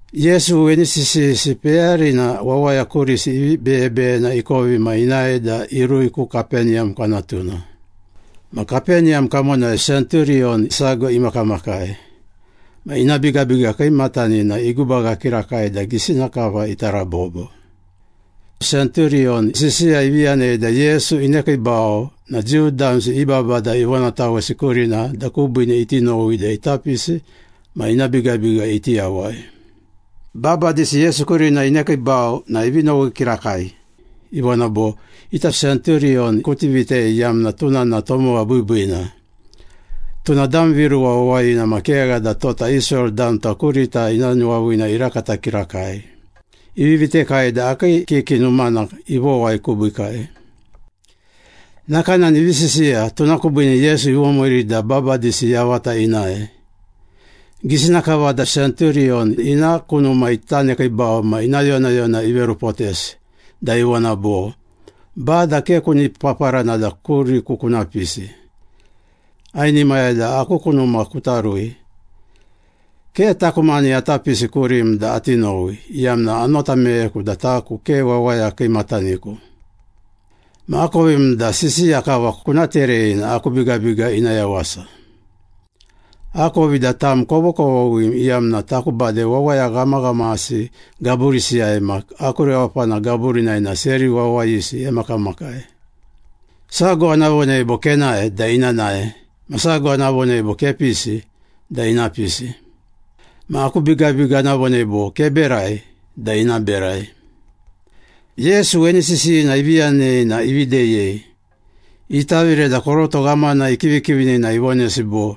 Yesu weni sisiyisi peyarina wawaya kurisi ivi beyebeyena ikovi ma inae da irui ku Kapeniyam kwanatuna. Ma Kapeniyam kamonai senturiyon sago imakamakai. Ma ina bigabiga kiimatanina igubaga kirakai da gisina kava ita rabobo. Senturiyon sisiya ivi yanei da Yesu inekiibau na Jiu damsi i babada ivonatawesi kurina da kubiine iti nowi da ita pisi ma ina bigabiga iti yawai. Babadisi Yesu kurina inekiibau na ivi nowi kirakai. Ivona bo, “Ita senturiyon kuti vitei iyamna tuna na tomowa biibiina. Tuna dam viruwa wawayina ma kegha da tota Israel damta kurita ina nuwaviina irakata kirakai. Ivi vitekai da akii kiki numana ivowai kubiikai.” Nakanani ivi sisiya, tuna kubiine Yesu ivomiiri da babadisi yavata inae. Gisina kava da senturiyon ina ku numa ita nekiibau ma ina yonayona iverupotesi da ivona bo, “Bada, ke kuni paparana da kuriku kuna pisi. Ainimaya da aku ku numa kuta rui. Ke taku mani ata pisi kurim da ati nowi, iyamna anota meyeku da taku ke wawaya kiimataniku. Ma akovim da sisiya kava kuna terei na aku bigabiga ina yawasa. Akovi da tam kovokovoghim, iyamna taku bade wawaya ghamaghamasi gaburisiyai ma aku rewapana gaburinai na seri wawayisi emakamakai. Sago ana vonei bo, ‘Kenae’ da ina nae. Ma sago ana vonei bo, ‘Kepisi’ da ina pisi. Ma aku bigabiga ana vonei bo, ‘Keberai’ da ina berai.” Yesu weni sisiyina ivi yanei na ivi deyei. Itavire da koroto ghamana ikivikivini na ivonesi bo,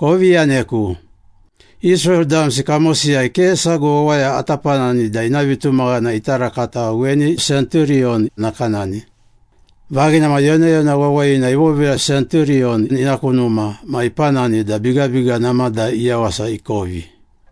“Kovi yaneku. Israel damsi kamosiyai ke sago wawaya ata panani da ina vitumaghana ita rakata weni senturiyon nakanani.” Vaghina ma yonayona wawayina ivovira senturiyon ina ku numa ma ipanani da bigabiga namada iyawasa ikovi.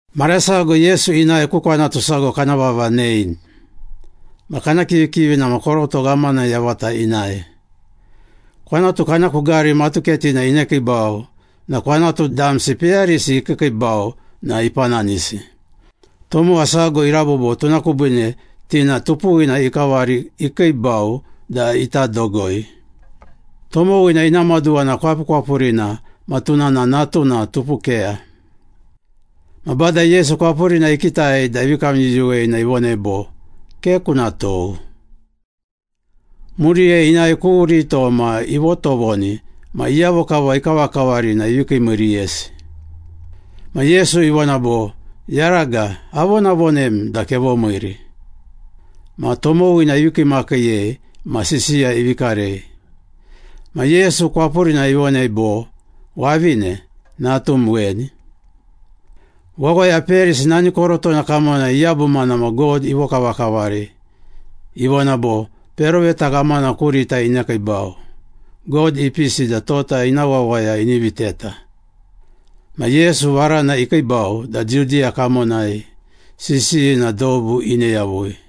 Mara sago Yesu inae ku kwanatu sago kana vava Nein. Ma kana kivikivina ma koroto ghamana yavata inae. Kwanatu kana ku gari matuketina inekiibau na kwanatu damsi peyarisi ikiikiibau na ipananisi. Tomowa sago irabobo tuna kubiine ti na tupuwina ikavari ikiibau da ita dogoi. Tomowina ina maduwa na kwapukwapurina ma tuna na natuna tupukeya. Ma Bada Yesu kwapurina ikitai da ivi kamyuyuwei na ivonei bo, “Ke kuna tou.” Muriyai inae ku rito ma ivotovoni ma iyavo kava ikavakavari na ivi kiimiiriyesi. Ma Yesu ivona bo, “Yaraga, avonavonem da kevomiiri.” Ma tomowina ivi kiimakiiyei ma sisiya ivi karei. Ma Yesu kwapurina ivonei bo, “Wavine, natum weni.” Wawaya peyarisi nani korotona kamonai iyabumana ma God ivokavakavari. Ivona bo, “Peroveta ghamana kurita inekiibau, God ipisi da tota ina wawaya ini viteta.” Ma Yesu varana ikiibau da Judiya kamonai sisiyina dobu ine yavui.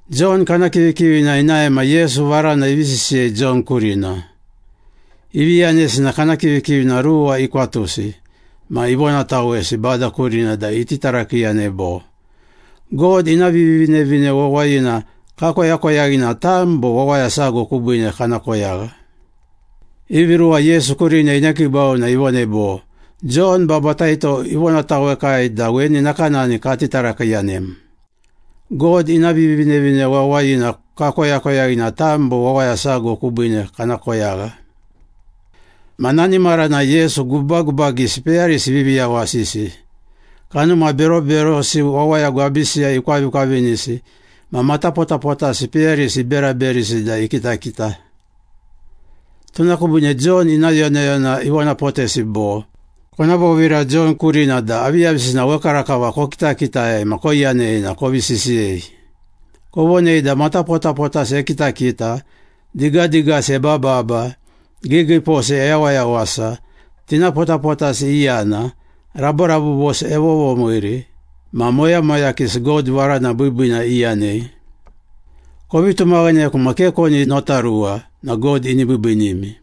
Jon kana kivikivina inae ma Yesu varana ivi sisiyei Jon kurina. Ivi yanesi na kana kivikivina ruwa ikwatusi ma ivonatawesi Bada kurina da iti tarakiiyanei bo, “God ina Vivinevine Wawayina kakoyakoyaghi na tam bo wawaya sago kubiine kana koyagha?” Ivi ruwa Yesu kurina inekiibau na ivonei bo, “Jon Babataito ivonatawekai da weni nakanani kati tarakiiyanem. ‘God ina Vivinevine Wawayina kakoyakoyaghi na tam bo wawaya sago kubiine kana koyagha?’” Ma nani maranai Yesu gubagubagisi peyarisi ivivi yawasisi, kanuma beroberosi wawaya gwabisiyai ikwavikwavinisi ma matapotapotasi peyarisi iberaberisi da ikitakita. Tuna kubiine Jon ina yonayona ivonapotesi bo, “Kona vovira Jon kurina da aviyavisina wekarakava kokitakitai ma koiyanei na kovi sisiyei. Kovonei da matapotapotasi ekitakita, digadigasi ebababa, giigiiposi eyawayawasa, tinapotapotasi iyana, raborabobosi evovomiiri, ma moyamoyakisi God varana biibiina iyanei. Kovi tumaghaneku ma ke koni notaruwa na God ini biibiinimi.”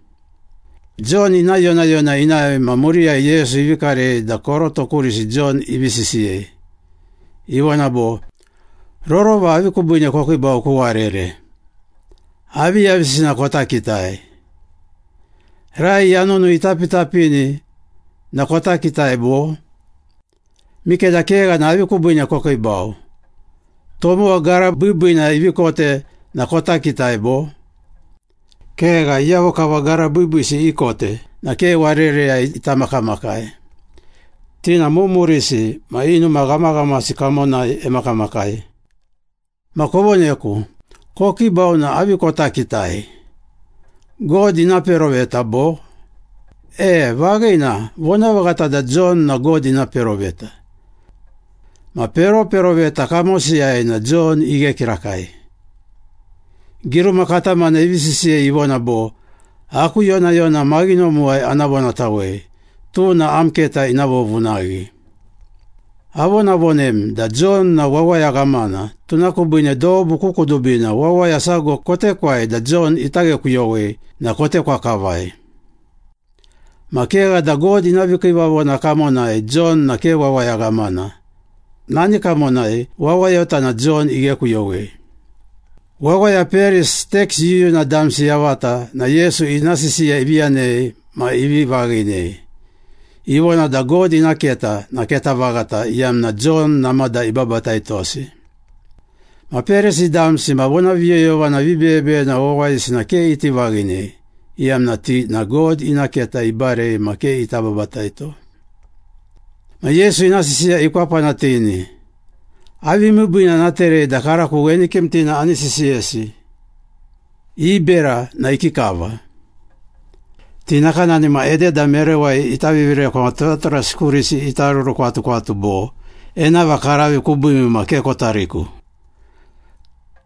Jon ina yonayona inae ma muriyai Yesu ivi karei da koroto kurisi Jon ivi sisiyei. Ivona bo, “Rorova avi kubiine kokiibau ku warere? Aviyavisina kota kitai? Rai yanunu itapitapini na kota kitai, bo? Mikeda kegha na avi kubiine kokiibau? Tomowa gara biibiina ivi kote na kota kitai, bo? Kegha, iyavo kava gara biibiisi ikote na ke warereyai ita makamakai, ti na mumurisi ma i numa ghamaghamasi kamonai emakamakai. Ma, kovoneku. Kokiibau na avi kota kitai? God ina peroveta, bo? E, vaghina, vonavaghata da Jon na God ina peroveta. Ma peroperoveta kamosiyai na Jon ighe kirakai. Giruma katamana ivi sisiyei, ivona bo, ‘Aku yonayona maghinomuwai ana vonatawei. Tuna am keta ina vovunaghi.’ Avonavonemi da Jon na wawaya ghamana, tuna kubiine dobu ku kudubina wawaya sago kotekwai da Jon ita ghekuyowei na kotekwa kavai. Ma kegha da God ina vikiivavona kamonai Jon na ke wawaya ghamana. Nani kamonai wawayota na Jon ighekuyowei.” Wawaya peyarisi, teks yuyuna damsi yavata na Yesu ina sisiya ivi yanei ma ivi vaghinei. Ivona da God ina keta na keta vaghata iyamna Jon namada ibabataitosi. Ma Perisi damsi ma vonaviyoyovana vibeyebeyena wawayisi na ke iti vaghinei, iyamna ti na God ina keta ibarei ma ke ita babataito. Ma Yesu ina sisiya ikwapanatini. “Avi miibiina ana terei da karako weni kimtina ani sisiyesi? I bera na ikikava? Ti nakanani ma ededa merewai ita vivirekwa ma turaturasi kurisi ita rurukwatukwatu bo, ‘Enava karavi kubiimi na ke kota riku.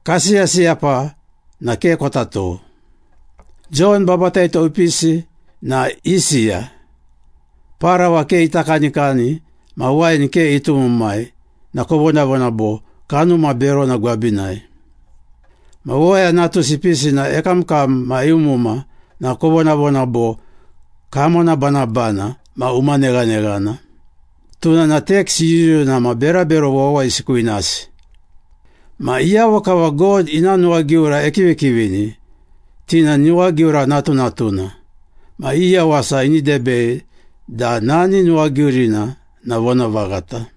Kasiyasiyapa na ke kota tou.’ Jon Babataito ipisi na isiya, parawa ke ita kanikani ma wain ke itumumai na kovonavona bo, ‘Kanuma berona gwabinai.’ Ma Wawaya Natusi ipisi na ekamkam ma eumuma na kovonavona bo, ‘Kamonabanabana ma umaneghaneghana. Tuna na teks yuyuna ma berabero wawayisi kwinasi.’ Ma iyavo kava God ina nuwagiura ekivikivini, ti na nuwagiura natunatuna. Ma i yawasa ini debei da nani nuwagiurina na vonavaghata.”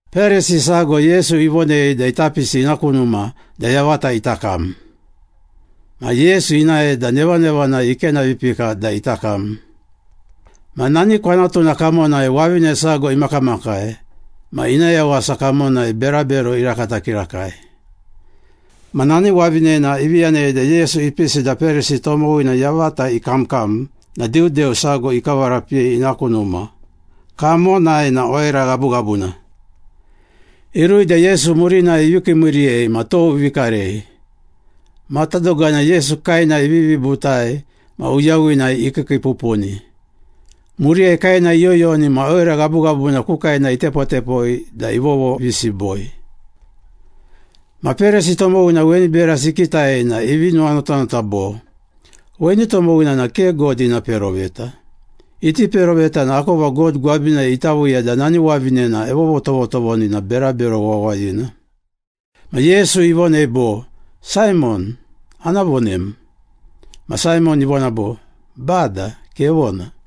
Perisi sago Yesu ivonei da ita pisi ina ku numa da yavata ita kam. Ma Yesu inae da nevanevanai ikenavipika da ita kam. Ma nani kwanatuna kamonai wavine sago imakamakai, ma ina yawasa kamonai berabero irakata kirakai. Ma nani wavinena ivi yanei da Yesu ipisi da Perisi tomowina yavata ikamkam na diudeu sago ikavarapiyei ina ku numa, kamonai na oira ghabughabuna. Irui da Yesu murinai ivi kiimiiriyei ma tou ivi karei. Matadogana Yesu kaena ivivi butai ma uyawinai ikiikiipupuni. Muriyai kaena iyoyoni ma oira ghabughabuna ku kaena itepotepoi da ivovovisiboi. Ma Perisi tomowina weni berasi ikitai na ivi nuwanotanota bo, “Weni tomowina na ke God ina peroveta. Iti peroveta na akova God gwabinai ita viiya da nani wavinena evovotovoni na berabero wawayina.” Ma Yesu ivonei bo, “Saimon, ana vonem.” Ma Saimon ivona bo, “Bada, kevona.”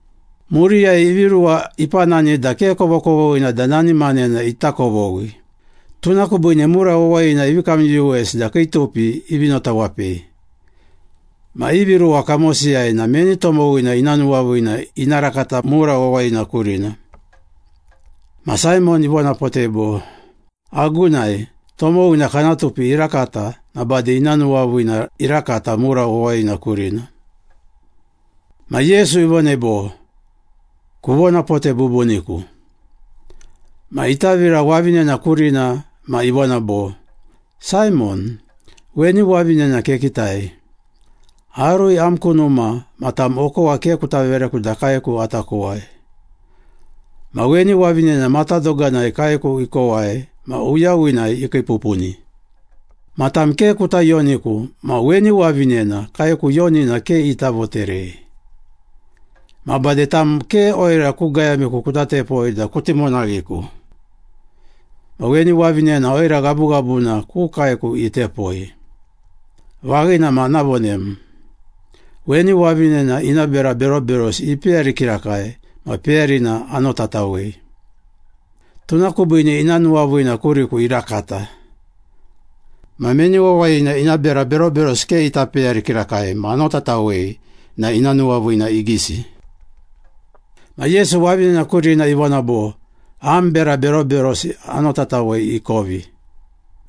Muriyai ivi ruwa ipanani da ke kovokovoghina da nani manena ita kovoghi, tuna kubiine mura wawayina ivi kamyuyuwesi da kii tupi ivi notawapei. Ma ivi ruwa kamosiyai na meni tomowina ina nuwaviina ina rakata mura wawayina kurina?” Ma Saimon ivonapotei bo, “Agunai, tomowina kana tupi irakata na bade ina nuwaviina irakata mura wawayina kurina.” Ma Yesu ivonei bo, “Kuvonapote bubuniku.” Ma itavira wavinena kurina ma ivona bo, “Saimon, weni wavinena kekitai. Arui am ku numa na tam, okowa ke kuta vereku da kaeku ata kowai. Ma weni wavinena matadoganai kaeku ikowai ma uyawinai ikiipupuni. Ma tam ke kuta yoniku, ma weni wavinena kaeku yonina ke ita voterei. Ma bade tam ke oira ku gayamiku kuta tepoi da kuti monaghiku. Ma weni wavinena oira ghabughabuna ku kaeku itepoi. Vaghina ma ana vonem. Weni wavinena ina bera beroberosi ipeyari kirakai ma peyarina anotatawei. Tuna kubiine ina nuwaviina kuriku irakata. Ma meni wawayina ina bera beroberosi ke ita peyari kirakai ma anotatawei na ina nuwaviina igisi.” Ma Yesu wavinena kurina ivona bo, “Am bera beroberosi anotatawei ikovi.”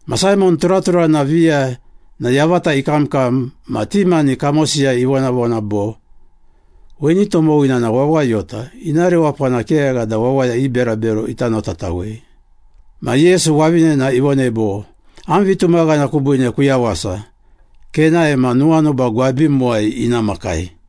Ma Saimon turaturana viya na yavata ikamkam ma ti mani kamosiyai ivonavona bo, “Weni tomowina na wawayota, ina rewapana kegha da wawaya i berabero ita notatawei.” Ma Yesu wavinena ivonei bo, “Am vitumaghana kubiine kuyawasa. Kenae ma nuwanuba gwabimuwai ina makai.”